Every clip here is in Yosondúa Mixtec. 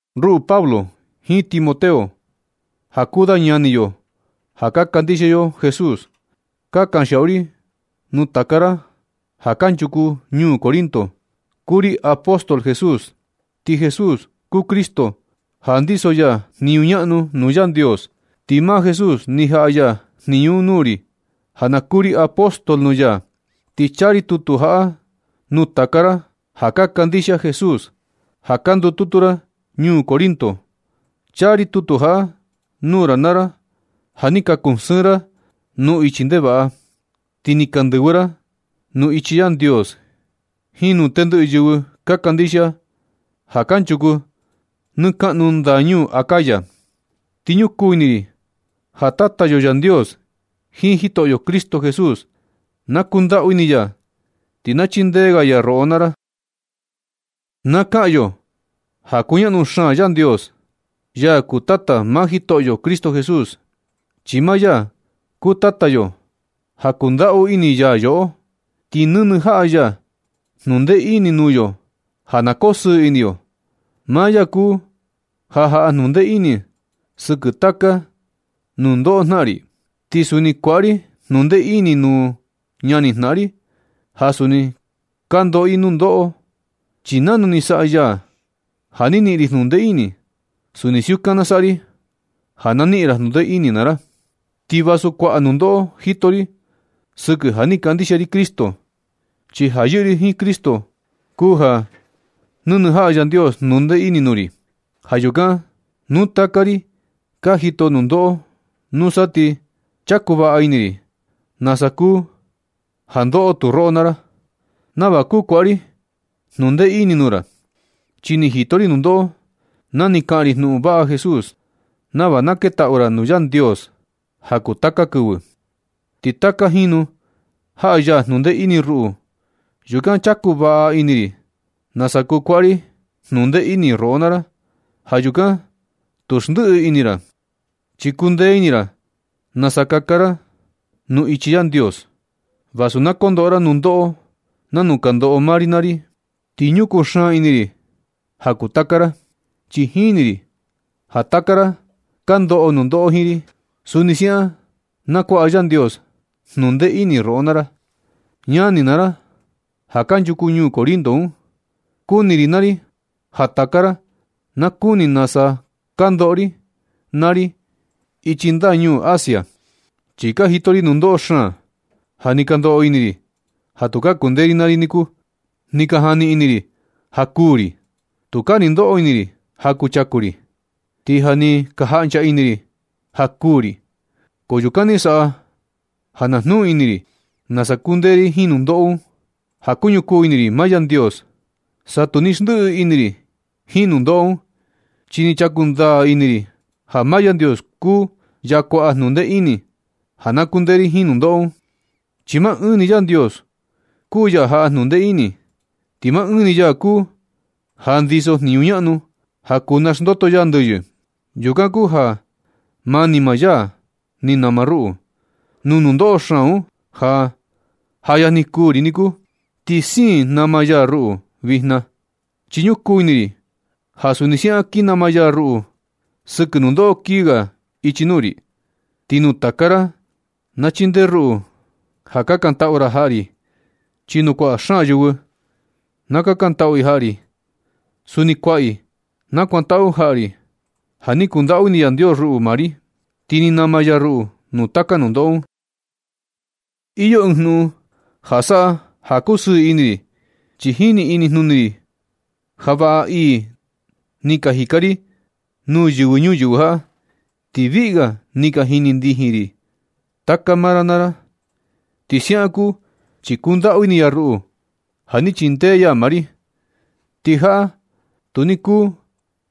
Ruꞌu Pablo jiin Timoteo, ja kuu da ñani yo ja ka kandixia yo Jesús, ka kanxiaꞌu ri nuu taka ra ja kanchuku ñuu Corinto. Kuu ri apóstol Jesús, ti Jesús kuu Cristo ja ndiso ya jniñu ñaꞌnu nuu Yandios, ti maa Jesús ni jaꞌa ya jniñu un nuu ri ja na kuu ri apóstol nuu ya. Ti chaa ri tutu jaꞌa nuu taka ra ja ka kandixia Jesús, ja ka ndututu ra ñuu Corinto. Chaa ri tutu jaꞌa nuu ra naa ra ja ni ka kusɨɨn ra nuu ichi ndevaꞌa, ti ni ka ndɨvɨ ra nuu ichi Yandios jiin nuu tendɨꞌɨ yɨvɨ ka kandixia ja kanchuku nɨ kaꞌnu ndañuu Acaya. Ti ñukuu ini ri ja Tata yo Yandios jiin Jitoꞌyo Cristo Jesús na kundaꞌu ini ya, ti na chindee ga ya roꞌo naa ra. Na kaꞌan yo ja kuñaꞌnu xaan Yandios, Yaa kuu Tata maa Jitoꞌyo Cristo Jesús. Chi maa ya kuu Tata yo ja kundaꞌu ini ya yoꞌo, ti nɨnɨ jaꞌa ya jnundee ini nuu yo ja na kosɨɨ ini yoꞌo. Maa ya kuu ja jaꞌa jnundee ini sɨkɨ taka nundoꞌo jnaꞌan ri, ti suni kuaꞌa ri jnundee ini nuu ñani jnaꞌan ri ja suni ka ndoꞌo i nundoꞌo. Chi nanu ni saꞌa ya ja ni niꞌin ri jnundee ini, suni siukan na saꞌa ri ja na niꞌin ra jnundee ini naa ra. Ti vasu kuaꞌa nundoꞌo jito ri sɨkɨ ja ni kandixia ri Cristo, chi ja yɨꞌɨ ri jiin Cristo kuu ja nɨnɨ jaꞌa Yandios jnundee ini nuu ri. Ja yukan, nu taka ri ka jito nundoꞌo, nusa ti chaku vaꞌa ini ri nasa kuu ja ka ndoꞌo tu roꞌo naa ra, nava kuu kuaꞌa ri jnundee ini nuu ra. Chi ni jito ri nundoꞌo na ni kaꞌan ri jnuꞌun vaꞌa Jesús, nava na ketaꞌu ra nuu Yandios ja kuu taka kɨvɨ. Ti taka jinu jaꞌa ya jnundee ini ruꞌu, yukan chaku vaꞌa ini ri nasa kuu kuaꞌa ri jnundee ini roꞌo naa ra. Ja yukan tu xndiꞌi ini ra, chi kundee ini ra nasa kaka ndaa ra nuu ichi Yandios, vasu na kondoꞌo ra nundoꞌo nanu ka ndoꞌo maa ri naa ri. Ti ñukuu xaan ini ri ja kuu taka ra, chi jini ri ja nu taka ra ka ndoꞌo nundoꞌo jiin ri, suni siaꞌan na kuaꞌa Yandios jnundee ini roꞌo naa ra. Ñani naa ra, ja kanchuku ñuu Corinto un, kuni ri naa ri ja taka ra na kuni nasa ni ka ndoꞌo ri naa ri ichi ndañuu Asia. Chi ni ka jito ri nundoꞌo xaan, ja ni ka ndoꞌo ini ri ja tukaa kundee ri naa ri niku. Ni ka jani ini ri ja kuū ri. Tukaa ni ndoꞌo ini ri ja kuchaku ri. Ti ja ni ka jaꞌncha ini ri ja kuū ri. Ko yukan ni saꞌa ja na jnuu ini ri nasa kundee ri jiin nundoꞌo un ja kuñukuu ini ri maa Yandios. Sa tu ni xndiꞌi ini ri jiin nundoꞌo un, chi ni chaku ndaa ini ri ja maa Yandios kuu ya kuaꞌa jnundee ini ja na kundee ri jiin nundoꞌo un, chi maa ɨɨn ni Yandios kuu ya jaꞌa jnundee ini, ti maa ɨɨn ni ya kuu ja ndiso jniñu ñaꞌnu ja kuu naxndoto ya ndɨyɨ. Yukan kuu ja mani maa ya ni nama ruꞌu nuu nundoꞌo xaan un ja ja yajni kuū ri niku, ti siin nama ya ruꞌu vijna. Chi ñukuu ini ri ja suni siaꞌan kin nama ya ruꞌu sɨkɨ nundoꞌo kii ga ichi nuu ri. Ti nu taka ra na chindee ruꞌu ja kakantaꞌu ra jaꞌa ri, chi nu kuaꞌa xaan yɨvɨ na kakantaꞌu i jaꞌa ri, suni kuaꞌa i nakuantaꞌu jaꞌa ri ja ni kundaꞌu ini Yandios ruꞌu naa ri, ti ni nama ya ruꞌu nuu taka nundoꞌo un. Iyo ɨɨn jnuꞌun ja saꞌa ja kusɨɨ ini ri. Chi jini inijnuni ri ja vaꞌa ii ni ka jika ri nuu yɨvɨ ñuyɨvɨ jaꞌa, ti viꞌi ga ni ka jini ndijin taka maa ra naa ra. Ti siaꞌan kuu chi kundaꞌu ini ya ruꞌu ja ni chindee ya maa ri. Ti jaꞌa tu ni kuu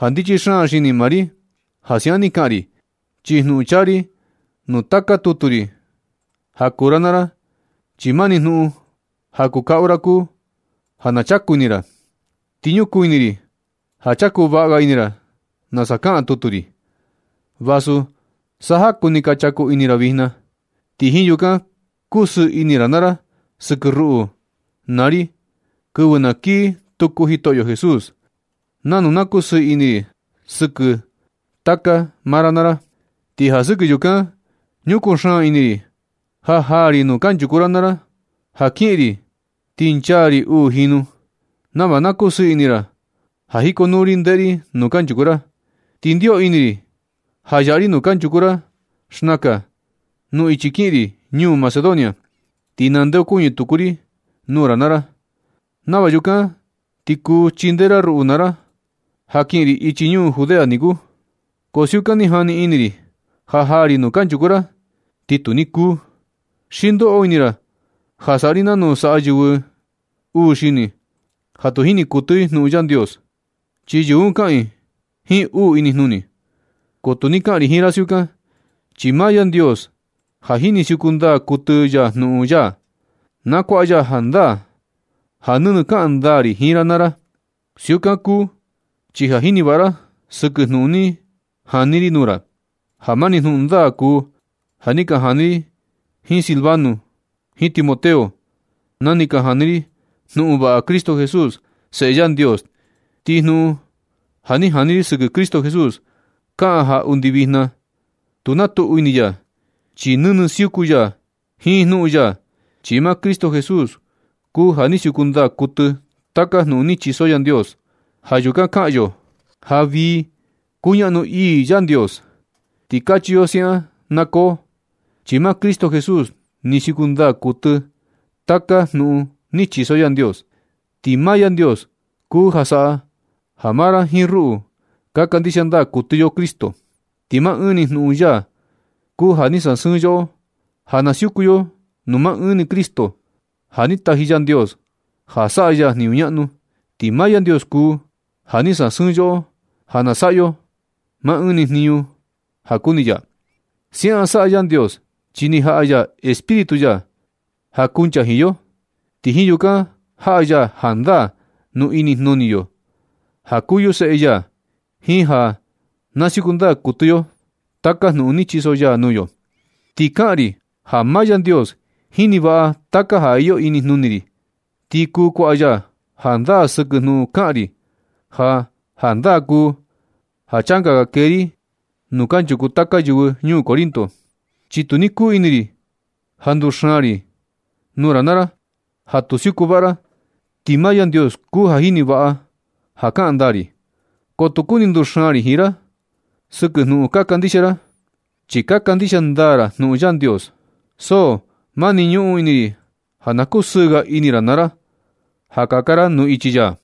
ja ndichi xaan xini maa ri ja siaꞌan ni jika ri. Ti jnuꞌun chaa ri nuu taka tutu ri ja kuu ra naa ra, chi mani jnuꞌun ja kuu kaꞌu ra kuu ja na chaku ini ra. Ti ñukuu ini ri ja chaku vaꞌa ga ini ra nasa kaꞌan tutu ri, vasu sa jaku ni ka chaku ini ra vijna. Ti jiin yukan kuu kusɨɨ ini ra naa ra sɨkɨ ruꞌu naa ri kɨvɨ na kii tuku Jitoꞌyo Jesús, nanu na kusɨɨ ini ri sɨkɨ taka maa ra naa ra. Ti ja sɨkɨ yukan ñukuu xaan ini ri ja jaa ri nuu kanchuku ra naa ra, ja kiꞌin ri, ti nchaa ri uu jinu, nava na kusɨɨ ini ra ja jikonuu ri ndeꞌe ri nuu kanchuku ra. Ni ndio ini ri ja yaꞌa ri nuu kanchuku ra xnakan nuu ichi kiꞌin ri ñuu Macedonia, ti nandeokuñɨ tuku ri nuu ra naa ra, nava yukan ti kuu chindee ra ruꞌu naa ra ja kiꞌin ri ichi ñuu Judea niku. Ko siukan ni jani ini ri, ja jaa ri nuu kanchuku ra, ti tu ni kuu. Xi ndoꞌo ini ra ja saꞌa ri nanu saꞌa yɨvɨ uu xini, ja tu jini kuɨtɨ i jnuꞌun Yandios, chi yɨvɨ un kaꞌan i jiin uu inijnuni. Ko tu ni kaꞌan ri jiin ra siukan, chi maa Yandios ja nɨnɨ siuku ndaa kuɨtɨ ya jnuꞌun ya, na kuaꞌa ya jandaa ja nɨnɨ kaꞌan ndaa ri jiin ra naa ra. Siukan kuu chi ka jini vaꞌa ra sɨkɨ jnuꞌun ni jani ri nuu ra, ja mani jnuꞌun ndaa kuu ja ni ka jani ri jiin Silvano jiin Timoteo, na ni ka jani ri jnuꞌun vaꞌa Cristo Jesús, Seꞌe Yandios. Ti jnuꞌun ja ni ka jani ri sɨkɨ Cristo Jesús kaꞌan ja undi vijna tu na tuꞌu ini ya, chi nɨnɨ siuku ya jiin jnuꞌun ya. Chi maa Cristo Jesús kuu ja ni siuku ndaa kuɨtɨ taka jnuꞌun ni chiso Yandios. Ja yukan kaꞌan yo ja vii kuñaꞌnu ii Yandios, ti kachi yo siaꞌan na koo, chi maa Cristo Jesús ni siuku ndaa kuɨtɨ taka jnuꞌun ni chiso Yandios. Ti maa Yandios kuu ja saꞌa ja maa ra jiin ruꞌu ka kandixia ndaa kuɨtɨ yo Cristo, ti maa ɨɨn ni jnuꞌun ya kuu ja ni sasɨɨn yoꞌo ja na siuku yo nuu maa ɨɨn ni Cristo, ja ni taji Yandios ja saꞌa ya jniñu ñaꞌnu. Ti maa Yandios kuu ja ni sasɨɨn yoꞌo ja na saꞌa yo maa ɨɨn ni jniñu ja kuni ya. Siaꞌan saꞌa Yandios, chi ni jaꞌa ya Espíritu ya ja kuncha jiin yo, ti jiin yukan jaꞌa ya jandaa nuu inijnuni yo ja kuu yo seꞌe ya, jiin ja na siuku ndaa kuɨtɨ yo taka jnuꞌun ni chiso ya nuu yo. Ti kaꞌan ri ja maa Yandios jini vaꞌa taka ja iyo inijnuni ri, ti kuu kuaꞌa ya jandaa sɨkɨ jnuꞌun kaꞌan ri ja jandaa kuu ja changa ga kee ri nuu kanchuku taka yɨvɨ ñuu Corinto, chi tu ni kuu ini ri ja nduxaan ri nuu ra naa ra ja tu siuku vaꞌa ra. Ti maa Yandios kuu ja jini vaꞌa ja kaꞌan ndaa ri. Ko tu kuni nduxaan ri jiin ra sɨkɨ jnuꞌun ka kandixia ra, chi ka kandixia ndaa ra jnuꞌun Yandios. So mani ñuꞌun ini ri ja na kusɨɨ ga ini ra naa ra ja kaka ra nuu ichi ya.